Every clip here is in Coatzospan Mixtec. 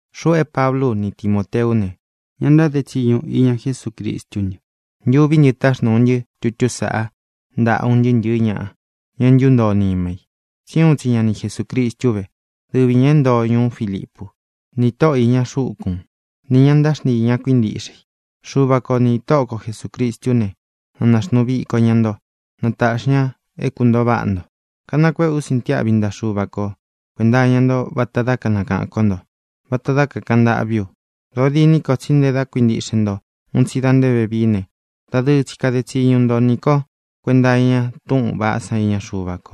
Xuꞌu é Pablú u ni Timōteú ne, ña ntáde tsiñu iña Jesúcristú ntɨ. Ntuví ntɨ táxnūu ntɨ́ tutú saꞌa ntaꞌa un ntɨɨ́ ntɨ̄ɨ́ ñaꞌa, ña é ntúntoo nima i, tsí uun tsi ña ni Jesūcristu vé, dɨvi ñā é ntoo ñuú Filipu, ni tóꞌo īña xúkun, nī ña ntáxntii ña kuíntiꞌxe i. Xuva ko nī Tóꞌo ko Jesūcristú ne, na nāxnuu viko ña nto. Na tāꞌxi ña é kuntōo váꞌa nto. Kanakuéꞌe ú sintiáꞌvi ntaꞌa Xuva ko kuēnta iña nto vata dá kanakaꞌān kó nto, vata dá kakāꞌan ntâꞌví u. Dōo diní ko, tsí nte da kuíntiꞌxe nto un tsi da nté vevií ne, dadɨɨ tsi kade tsiñu nto nī kó kuenta iña túꞌūn vaꞌá san iña Xuva ko.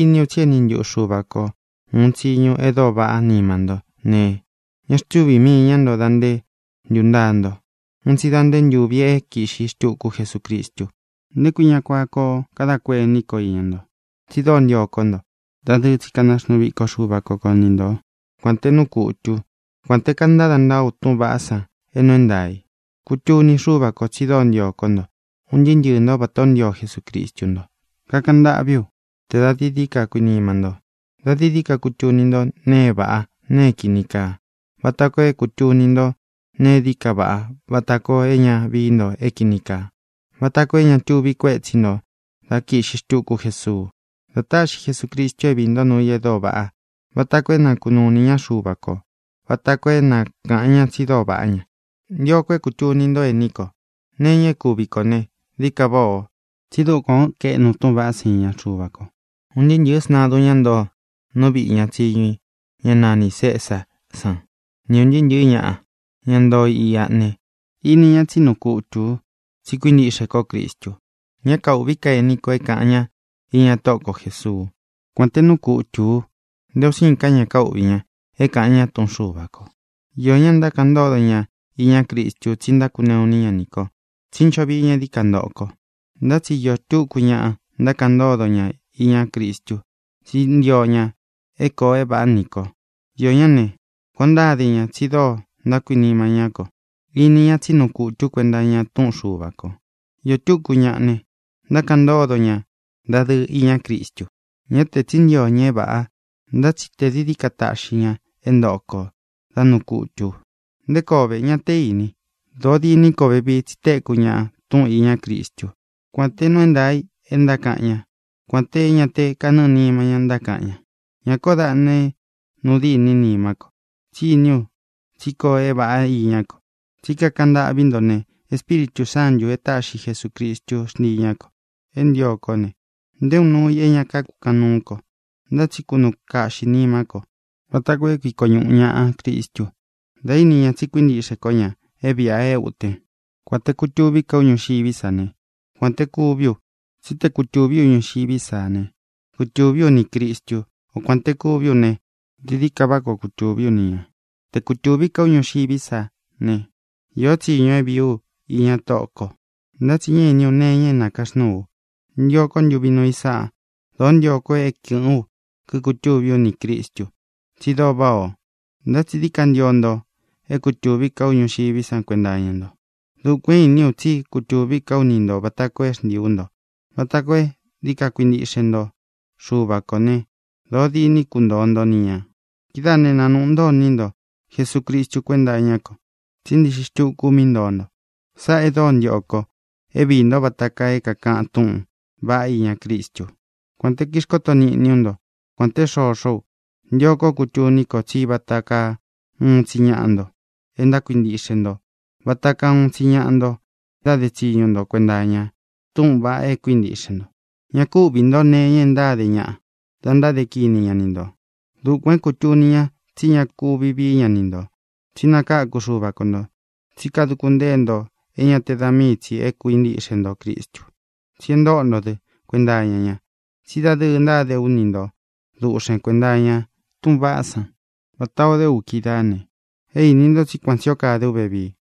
Iní u tsi é eni ntuꞌu Xuva ko ūun tsiñu e dóo vaꞌá nima ntó ne, ña xtúvī mii ña nto da nté ntūntaa nto, un tsi da nté ntūvi é kīꞌxi xtuku Jesucristu. ¿Nté kui ña kuan koo kadá kuení ko iña nto? Tsi dóo ntio kó nto. Dadɨɨ tsi kanaxnuu viko Xuva ko ko ni nto, kuān té nuu kutū ú, kuān té kantada ntaa ú túꞌūn vaꞌá san é nuu é ntaā i. Kutuni Xúva kō tsi dóo ntio kó nto un ntɨɨ́ ntɨɨ̄ ntó vatā ó ntio Jesucristu nto. Kakaꞌan ntâꞌví u te dā dií dií ka kuinima ntó, dā dií dií ka kutuni ntó nēe é vāꞌá, nēe é kīni kaa, vata koo é kūtuni ntó nēe é dií ka vaꞌá, vata koo é ña vií nto é kīni kaa, vata koo é ña tuvi kuétsi ntō dá kīꞌxi xtuku Jesuu. Dá tāꞌxi Jesucristu é viī ntó nuu i e dóo vaꞌá, vata koo é na kūnuu iní ñaꞌa Xuva kō, vata koo é na kāꞌan ña tsi dóo vaꞌá ña. Ntio ko é kūtuni ntó, ení ko, nee iña é kūvi kó ne, dií ka váꞌā o, tsí dukuān ó kaeꞌnu túꞌūn vaꞌá san iña Xuva ko. Un ntɨɨ́ ntɨ̄ɨ́ sntadun, ñá ntoo nú viꞌi ña tsiñu i, ñá nanī Cesá san, ni ūn ntɨɨ́ ntɨ̄ɨ́ ñaꞌa, ña ntoo iꞌa ne, ini ña tsí nuu kutū u tsi kuíntiꞌxe kó Cristu. Ñá kaūꞌví ka ení kō é kāꞌan ña iña Tóꞌo ko Jēsuú, kuān té nuu kutū u. Nté un siin ka ña káuꞌvī ña é kāꞌan ña túꞌun Xuva kō. Iō ñá ntákaꞌan ntódo ña iñá Cristu tsí ntákuneꞌu iní ña nī ko, tsí ncho vií ña é dií ka ntoꞌo ko. Ntá tsi iō túku ñaꞌa ntákaꞌan ntódo ña iñá Cristu tsí ntio ña é kōo é vāꞌá nī ko. Iō ñáꞌa ne, kuān o ntáde ña tsi dóo ntákuinima ñá ko. Ini ña tsí nuu kutū ú kuenta iña túꞌun Xuva kō. Iō túku ñaꞌa ne, ntákaꞌan ntódo ña dadɨɨ iñá Cristu, ñá tē tsí ntio ña é vāꞌa, ntá tsi tē dií dií ka taꞌxi ña é ntōꞌo ko dá nuu kutū u. ¿Nté koo ve? Ña té īni. Dōo diní ko vevii, tsi téku ñaꞌa túꞌun īñá Cristú, kuān té nuu é ntaā i e ntákaꞌan ñá, kuān té ña te kánɨɨ nima ñá ntákaꞌan ña. Ña kóo daꞌna é nuu diní nimá ko, tsí iní u tsí koo é vāꞌá iñá ko, tsí kakaꞌan ntâꞌví nto ne, Espíritū Sántū e táꞌxi Jesūcristú xntii ñā ko. É ntīo kó ne, nté uun nuu i é ña kukáꞌan nuú ko, ntá tsi kunuu kaꞌxī nimá ko vata koo é kuiko ñuꞌu ñāꞌa Cristu da íni ña tsi kuíntiꞌxe kó ña é vīꞌa é ūtén, kuān te kutuví ka u ñuxiví sa ne, kuān te kuví u. Tsí te kutūví u ñuxiví sa ne, kutūví u nī Cristú, o kuān te kuví u ne, dií dií ka váꞌa koo kutūví u ni ñā. Te kutūví ka ú ñuxiví sa ne, iō tsíñu é vīí u iña Tóꞌō ko. Ntá tsi ñá īní u nee iña é nākaxnúū u. Ntio kó ntuvi núu i san. Dōó ntio ko é kɨ̄ꞌɨ́n u kíkutūví u nī Cristu, tsi dóo váꞌā o. Ntá tsi dií ka ntio nto é kutūví ka ú ñuxiví sa kuenta iña nto. Dukuān é īní u tsí kutūví ka ú ni ntō vata koo é xntiī ú nto, vata koo é dií ka kuintiꞌxe nto Xuva kō né, dōo diní kuntoo nto ni ñā. Kidáā né, nanūꞌu ntó iní nto Jesucristu kuénta iñá ko, tsí ntiꞌxi xtuku ú mí ntoo nto. Sáꞌā e dóo ntio ko: é viī ntó vata kaa é kākaꞌan túꞌūn vaꞌá iñá Cristu. Kuān te kixkóto niꞌní u nto, kuān té xoxó u, ntio kó kutuní ko tsí vata kaa uun tsi ñaꞌa nto e ntákuintiꞌxe nto, vata kaa uun tsi ñaꞌa nto ntáde tsiñu nto kuenta iña túꞌūn vaꞌa é kuíntiꞌxe nto. Ñá ku uꞌvī ntó nee iña e ntáde ñaꞌa da ntáde kini ña ni ntō. Dukuān é kūtuni ña tsí ña kuvi vií ña ni ntō, tsí nakākú Xuva ko ntō. Tsí kaduku ntée nto é ña te da míi tsī é kuīntiꞌxe nto Cristu, tsí e ntóꞌo ntō dɨ́ kuenta iña ña. Tsí dadɨɨ ntáde ú ni nto duꞌxen kuēnta iñá túꞌūn vaꞌá san vatā o dé u kídaā ne, é īni nto tsí kuan tsī ó kade ú vevii.